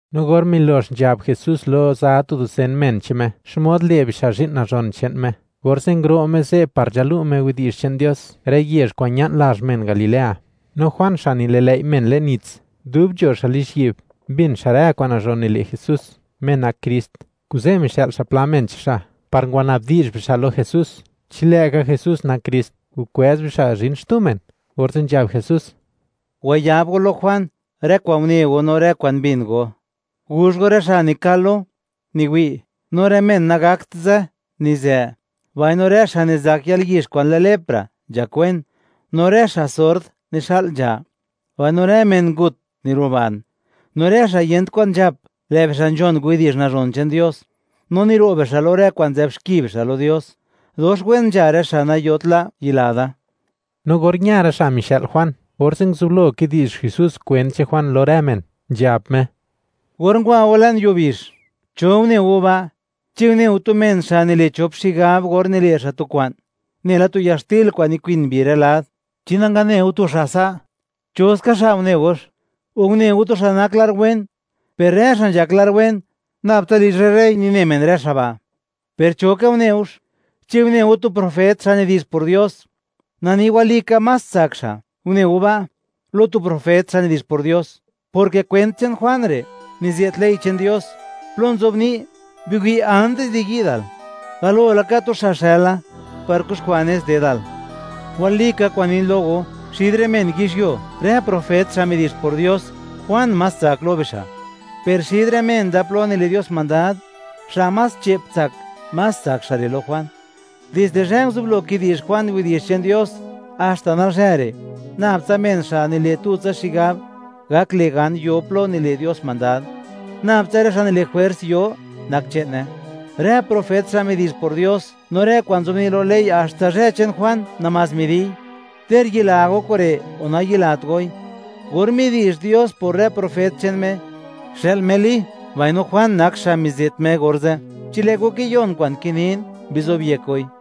No or milox nzhab Jesús lo za dusen men che'n Me xmod le' bixa' zhi'n nazhon che'n Me, orze' nguro' Me ze' par nzhalu' Me widi'zh che'n Dios rë yezh kwa'n ña'n lazh men Galilea. No Juan xa' nililëi' men le'n nits, dub nzho xa' lizhyi'b, mbin xa' rë kwa'n nazhon nile' Jesús, Me nak Krist, kuze' mixë'l xa' pla men che'n xa', par ngwana'bdi'zh bixa' lo Jesús, chi lë'ka Jesús nak Krist, o kwëz bixa' zhin xtu men. Orze' nzhab Jesús: ―Wayab go lo Juan rë kwa'n une go no rë kwa'n mbin go; guzh go, rë' xa' nikal lo, niwi'; no rë men nagakt zë, nizë; mbaino rë xa' nizak yalyizh kwa'n lë lepra, nzhakwen; no rë xa' sord, nixa'l nzha; mbaino rë men ngut, niruban; no rë xa' yent kwan nzhap, lë' bixa' nzhon widi'zh nazhon che'n Dios, no niro' bixa' lo rë kwa'n nzë'b xki bixa' lo Dios. ¡Dox wen nzha rë xa' nayot la', yila da! No or ña rë xa' mixë'l Juan, orze' nguzublo kidi'zh Jesús kwent che'n Juan lo rë men, nzhab Me: ―Or ngwa go le'n yuo bizh, ¿cho une go ba'? ¿Chi une go tu men xa' nile' chop xigab or nile' xa' tu kwa'n, nela tu yaxtil kwa'n nikwin mbi rë lad? Chi nangane go tu xa' sa', ¿cho ska xa' une gox? o, ¿une go tu xa' nak lar wen? Per rë xa' nzhak lar wen, nab tsa lizh rë rey nine men rë xa' ba'. ¿Per cho ka une gox? ¿Chi une go tu profet, xa' nidi'zh por Dios? Na ni walika, más tsak xa' une go ba' lo tu profet, xa' nidi'zh por Dios, porke kwent che'n Juan re' nize't ley che'n Dios, plo nzobni': Biwi', antis di yi'dal, galo laka tu xa' xëla par kuxkwa' nez dedal. Walika kwa'n nin lo go, xid rë men yizhyuo, rë profet xa' midi'zh por Dios, Juan más tsak lo bixa'; per xid rë men da, plo nile' Dios mandad, xa' más che'p tsak, más tsak xa' re' lo Juan. ’Dizde zhë nguzublo kidi'zh Juan widi'zh che'n Dios haxta nalzhë re', nab tsa men xa' nile' tutsa xigab gak le' gan yo plo nile' Dios mandad; nab tsa rë xa' nile' jwers yo, nak che'ne. Rë profet xa' midi'zh por Dios, no rë kwa'n nzobni' lo ley, haxta zhë che'n Juan namás midi'y. Ter yila go kure' o nayilat goi, or midi'zh Dios por rë profet che'n Me, xë'l Me Li, mbaino Juan nak xa' mize't Me orze'. Chi lë' go kiyon kwa'n kinin, bizobyek goi.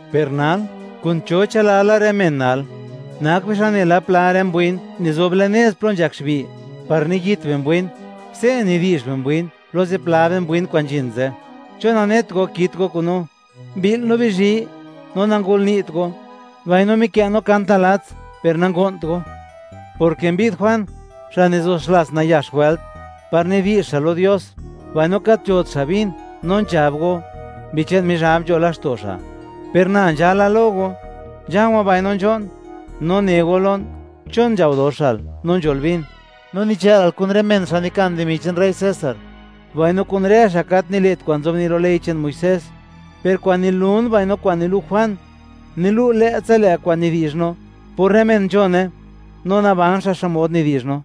’Per nal, ¿kun cho chë'lala rë men nal? Nak bixa' nela pla rë mbwin nizob le'n nez plo nzhak xbi' par niyit bimbwin; se' nidi'zh bimbwin lo zipla rë mbwin kwa'n nzhin ze': “¿Chon nanet go kit go kun no? Mbi'l no bizhi, no nangolni't go; mbaino mikë' no kant nalats, per nango'nt go”, porke mbi'd Juan, xa' nizo xlats nayax wëlt, par nidi'zh xa' lo Dios, mbaino gat nzhot xa' vin; no nzhab go: “Mbi che'n Mizhab nzho laxto' xa'.” Per na nzhala lo go, nzha̱o̱wa̱ mbaino nzho'n, no ne go lon: “¿Chon nzhao doxal, no nzhol vin? ¡No nichë'lal kun rë men xa' nikan dimi che'n rey César, mbaino kun rë xa' gat nile't kwa'n nzobni' lo ley che'n Muisés!” Per kwa'n nilun mbaino kwa'n nilu' Juan, nilu' lë'tsa lë' kwa'n nidi'zh no, por rë men nzhone no naban xa' xmod nidi'zh no.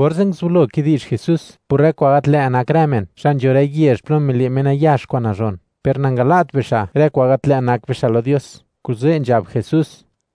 Orze' nguzublo kidi'zh Jesús por rë kwa'n gat lë' nak rë men xa' nzho rë yezh plo mile' Me nayax kwa'n nazhon, per nangala't bixa' rë kwa'n gat lë' nak bixa' lo Dios, kuze' nzhab Jesús: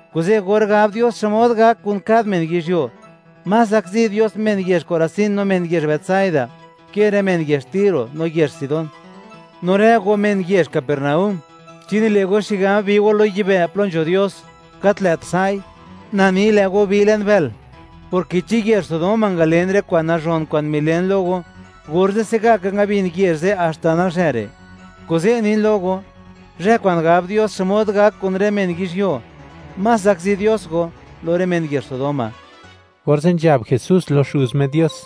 Kuze', or gab Dios xmod gak kun kad men yizhyuo, más zakzi Dios men yezh Korazín no men yezh Betsaida ke rë men yezh Tiro no yezh Sidón. No rë go men yezh Capernaúm, ¿chi nile' go xigab bi go lo yibë' plo nzho Dios? Gat lë't sa'i. Na ni, ¡lë' go bi le'n bël!, porke chi yezh Sodoma ngalen rë kwa'n nazhon kwa'n milen lo go, orze' se'gaka ngabin yezh ze' haxta nalzhë re'. Kuze' nin lo go, zhë kwa'n gab Dios xmod gak kun rë men yizhyuo, más zakzi Dios go, lo rë men yezh Sodoma. Orze' nzhab Jesús lo Xuz Me Dios: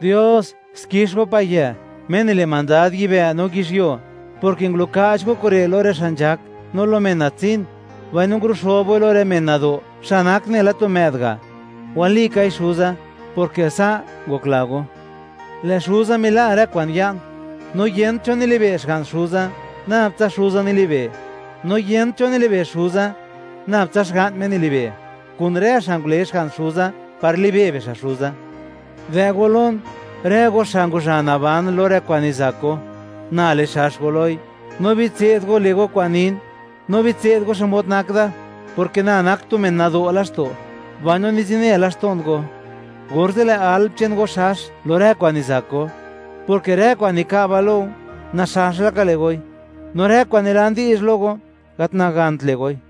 ―Dios, xkix Go, Payë', Me nile' mandad yibë' no yizhyuo, porke ngulu'ka'ch Go kure' lo rë xa' nzhak, no lo men natsin; mbaino ngulu'xo'b Goi lo rë men nado', xa' nak nela tu më'd ga'. Walikai Xuza, porke sa' ngokla Go. ’Lë' Xuza mila' rë kwa'n ya'n, no yent cho nili'be' Xga'n Xuza, nab tsa Xuza nilibe'; no yent cho nilibe' Xuza, nab tsa Xga'n Me nilibe', kun rë xa' ngule Xga'n Xuza, par libe' bixa' Xuza. Dë' go lon, rë go xa' ngwazha naban lo rë kwa'n nizak go; na le xax go loi. No bitse'd go le' go kwa'n nin, no bitse'd go xmod nak da, porke na nak tu men nado' laxto', mbaino nizine laxto'n go, orze' lë' alm che'n go xax lo rë kwa'n nizak go, porke rë kwa'n nika'ba lo go, naxax laka le' goi; no rë kwa'n nilan di'zh lo go, gat nagant le' goi.